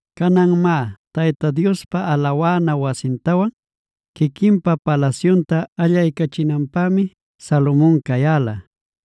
Canan má, Tayta Diospa alawana wasintawan quiquinpa palasyunta allaycachinanpämi Salomon cayäla.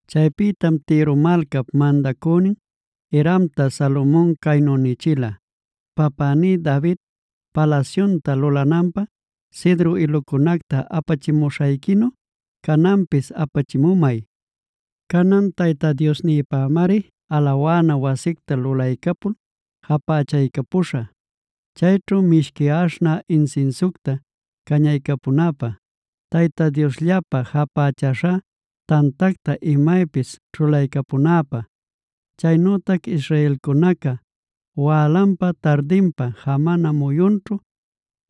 Chaypïtam Tiro malcap mandacünin Hiramta Salomon caynu nichila: “Papäní David palasyunta lulananpä cedro ilucunacta apachimuśhayquinu, cananpis apachimumay. Canan Tayta Diosnïpämari alawana wasicta lulaycapul japächaycapuśhä, chayćhu mishqui aśhnä insinsiucta cañaycunäpä, Tayta Diosllapä japächäśha tantacta imaypis ćhulaycapunäpä, chaynütac israelcunaca wälanpa tardinpa, jamana muyunćhu,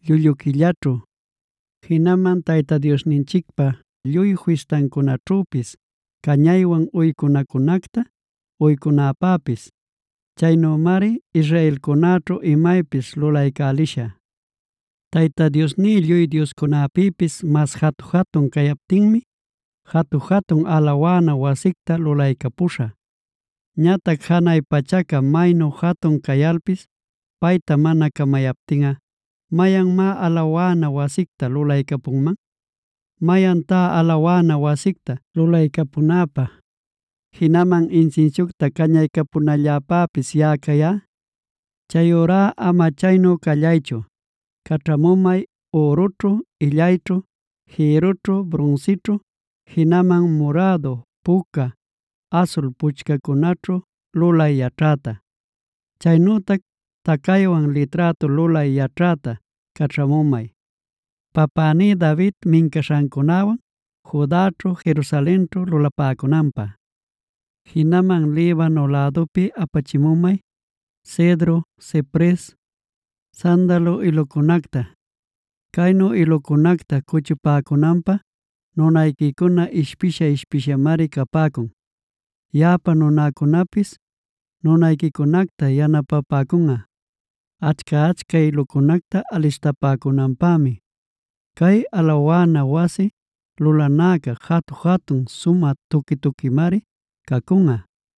llullu quillaćhu, jinaman Tayta Diosninchicpä lluy fistancunaćhüpis cañaywan uycunacunacta uycunäpäpis. Chaynümari israelcunäćhu imaypis lulaycälishä. Tayta Diosní lluy dioscunapïpis mas jatu-jatun captinmi, jatu-jatun alawana wasicta lulaycapuśhä. Ñatac ¿janay pachaca maynu jatun cayalpis payta mana camayaptinꞌa, mayanmá alawana wasictaa lulaycapunman? ¿Mayantá alawana wasicta lulaycapunäpä, jinaman insinsiucta cañaycapunalläpäpis yaꞌa cayá? Chayurá ama chaynu callaychu, caćhamumay ürućhu, illayćhu, jïrrućhu, brunsićhu, jinaman murädu, puca, asul puchcacunaćhu lulay yaćhäta. Chaynütac tacaywan liträtu lulay yaćhäta caćhamumay papäní David mincaśhancunawan Judaćhu Jerusalenćhu lulapäcunanpä. Jinaman Libano lädupi apachimumay: cedro, cipres, sandalo ilucunacta. Caynu ilucunacta cuchupäcunanpä nunayquicuna ishpisha-ishpishamari capäcun. Yaꞌapa nunäcunapis nunayquicunacta yanapapäcunꞌa, achca-achca ilucunacta alistapämunanpämi. Cay alawana wasi lulanäca, jatu-jatun, sumä tuqui-tuquimari cacunꞌa.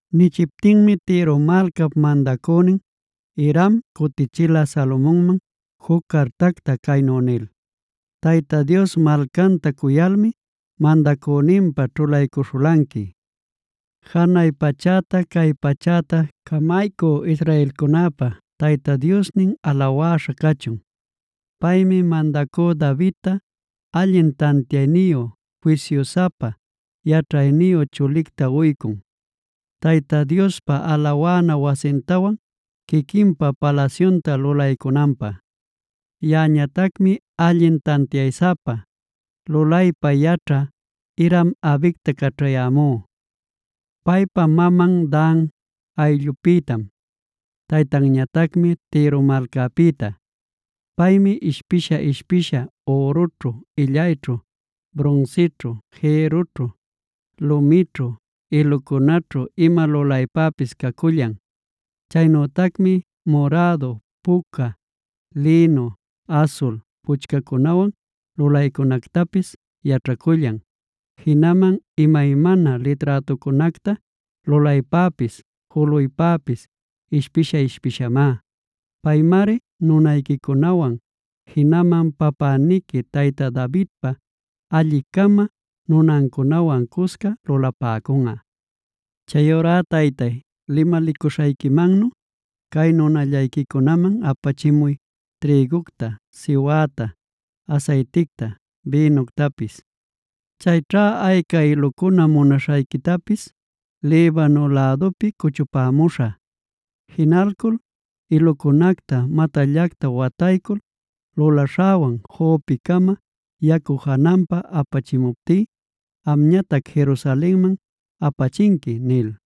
Nichiptinmi Tiro malcap mandacünin Hiram, cutichila Salomonman juc cartacta caynu nil: “Tayta Dios malcanta cuyalmi mandacüninpä ćhulaycuśhulanqui. Janay pachäta cay pachäta camaycü israelcunäpa Tayta Diosnin alawäśha cachun. Paymi mandacü Davidta allin tantiayniyu, fisyusapa, yaćhayniyu chulicta uycun, Tayta Diospa alawana wasintawan quiquinpa palasyunta lulaycunanpä. Yaꞌañatacmi allin tantiaysapa lulaypa yaćhä Hiram-abicta caćhayämú. Paypa maman Dan ayllupïtam, taytanñatacmi Tiro malcapïta. Paymi ishpisha-ishpisha ürućhu, illayćhu, brunsićhu, jïrrućhu, lumićhu, ilucunaćhu ima lulaypäpis cacullan. Chaynütacmi murädu, puca, lïnu, asul puchcacunawan lulaycunactapis yaćhacullan. Jinaman imaymana liträtucunacta lulaypäpis juluypäpis ishpisha-ishpishamá. Paymari nunayquicunawan, jinaman papäniqui tayta Davidpa alli-cama nunancunawan cusca lulapäcunꞌa. Chayurá taytay, limalicuśhayquimannu cay nunallayquicunaman apachimuy trïgucta, siwäta, asayticta, bïnuctapis. Chayćha ayca ilucuna munaśhayquitapis Libano lädupi cuchupämuśhä. Jinalcul ilucunacta matallacta wataycul luläśhawan Jopecama yacu jananpab apachimuptí, amñatac Jerusalenman apachinqui” nil.